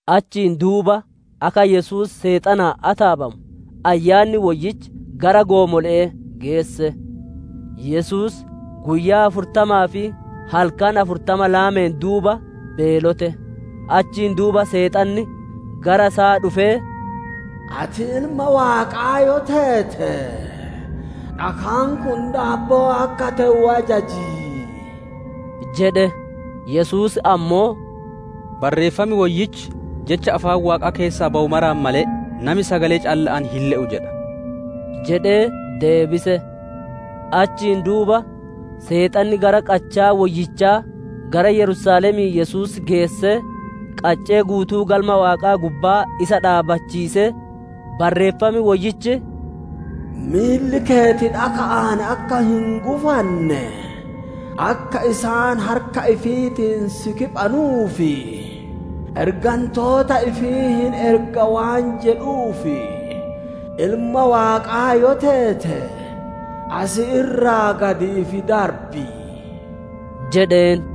Achiin duuba akka Yesuus Seexanaan ataabamu Ayyaanni Woyyichi gara goomole'ee geesse. Yesuus guyyaa afurtamaa fi halkan afurtama laameen duuba beelote. Achiin duuba Seexanni gara isaa dhufee, «Ati Ilma Waaqaa yoo teete, dhakaan kun daabboo akka te'u ajaji» jedhe. Yesuus ammoo, «Barreeffam Woyyichi, ‹Jecha afaan Waaqaa keessaa bawu maraan malee, nami sagalee calla'aan hin le'u› jedha» jedhee deebise. Achiin duuba Seexanni gara Qachaa Woyyichaa gara Yerusaalemii Yesuus geessee, qaccee guutuu Galma Waaqaa gubbaa isa dhaabbachiisee, «Barreeffam Woyyichi, «‹Miilli keeti dhaka'aan akka hin gufanne, akka isaan harka ifiitiin si kiphanuuf, ergantoota ifii hin erga› waan jedhuuf, Ilma Waaqaa yoo teete asi irraa gad if darbi» jedheen.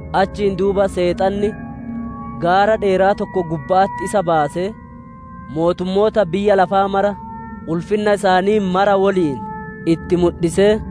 Achiin duuba Seexanni gaara dheeraa tokko gubba'atti isa baasee, mootummoota biyya lafaa mara, ulfinna isaanii mara woliin itti mudhisee,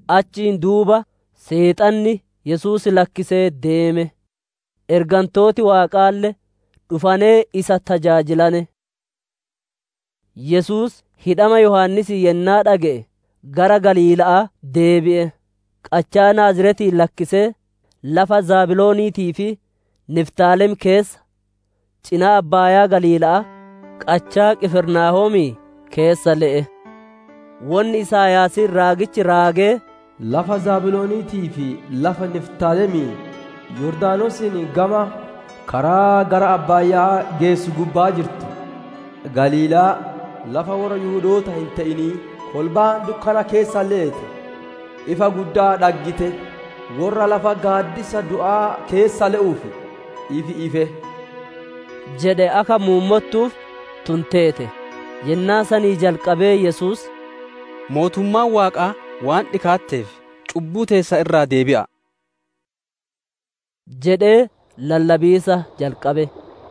Achiin duuba Seexanni Yesuus lakkisee deeme; ergantooti Waaqaalle dhufanee isa tajaajilane. Yesuus hidhama Yohaannisii yennaa dhage'e, gara Galiila'aa deebi'e. Qachaa Naaziretii lakkisee, lafa Zabilooniitii fi Niftaalem keessa, cinaa abbaayaa Galiila'aa, qachaa Qifirnaahoom keessa le'e. Wonni Isaayaasiin raagichi raagee, «Lafa Zabilooniitii fi lafa Niftaalemii, Yordaanosiin gama, karaa gara abbaaya'aa geessu gubbaa jirtu, Galiilaa, lafa worra Yihudootaa hin te'inii! Kolbaan dukkana keessa leete, ifa guddaa dhaggite. Worra lafa gaaddisa du'aa keessa le'uuf, ifi ife» jedhe akka muummottuuf tun teete. Yennaa sanii jalqabee Yesuus, «Mootummaan Waaqaa waan dhikaatteef, cubbuu teessan irraa deebi'a'a!» jedhee lallabiisa jalqabe.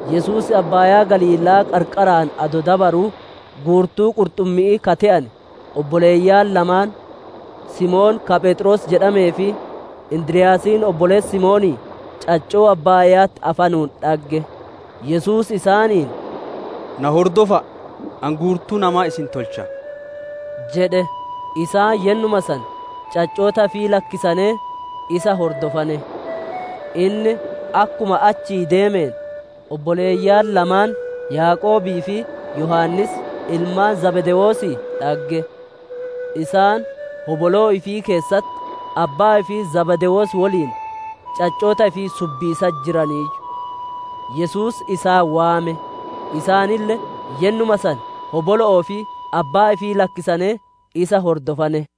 Yesuus abbaayaa Galiila'aa qarqaraan adoo dabaruu, guurtuu qurxummi'ii ka te'ane obboleeyyan lamaan: Simoon ka Pheexroos jedhamee fi Indiryaasiin obboleessi Simoonii caccoo abbaaya'atti afanuun dhagge. Yesuus isaaniin, «Na hordofa'a! Ani guurtuu namaa isin tolcha» jedhe. Isaan yennuma san caccoota ifii lakkisanee isa hordofane. Inni akkuma achii deemeen, obboleeyyan lamaan Yaaqoobii fi Yohaannis, ilmaan Zabdewoosii dhagge. Isaan hoboloo ifii keessatti abbaa ifii Zabdewoos woliin caccoota ifii subbiisatti jiraniiyyu. Yesuus isaan waame; isaanille yennuma san hobolo'oo fi abbaa ifii lakkisanee, isa hordofane.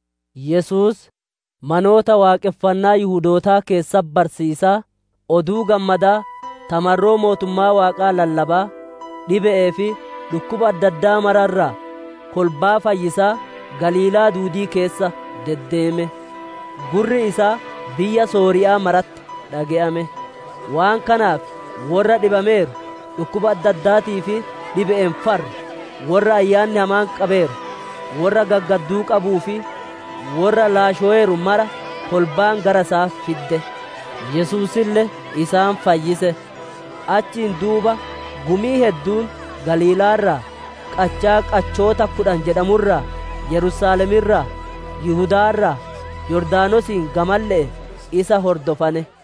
Yesuus manoota waaqonfannaa Yihudootaa keessatti barsiisaa, Oduu Gammadaa ta marroo mootummaa Waaqaa lallabaa, dhibe'ee fi dhukkuba adda addaa mara irraa kolbaa fayyisaa Galiilaa duudii keessa deddeeme. Gurri isaa biyya Sooriya'aa maratti dhage'ame; waan kanaaf worra dhibameeru, dhukkuba adda addaatii fi dhibe'een farru, worra ayyaanni hamaan qabeeru, worra gaggaadduu qabuu fi worra laashoweeru mara kolbaan gara isaa fidde. Yesuusille isaan fayyise. Achiin duuba gumiin hedduun Galiilaa irraa, Qachaa qachoota Kudhan jedhamu irraa, Yerusaalem irraa, Yihudaa irraa, Yordaanosiin gamalle'ee isa hordofane.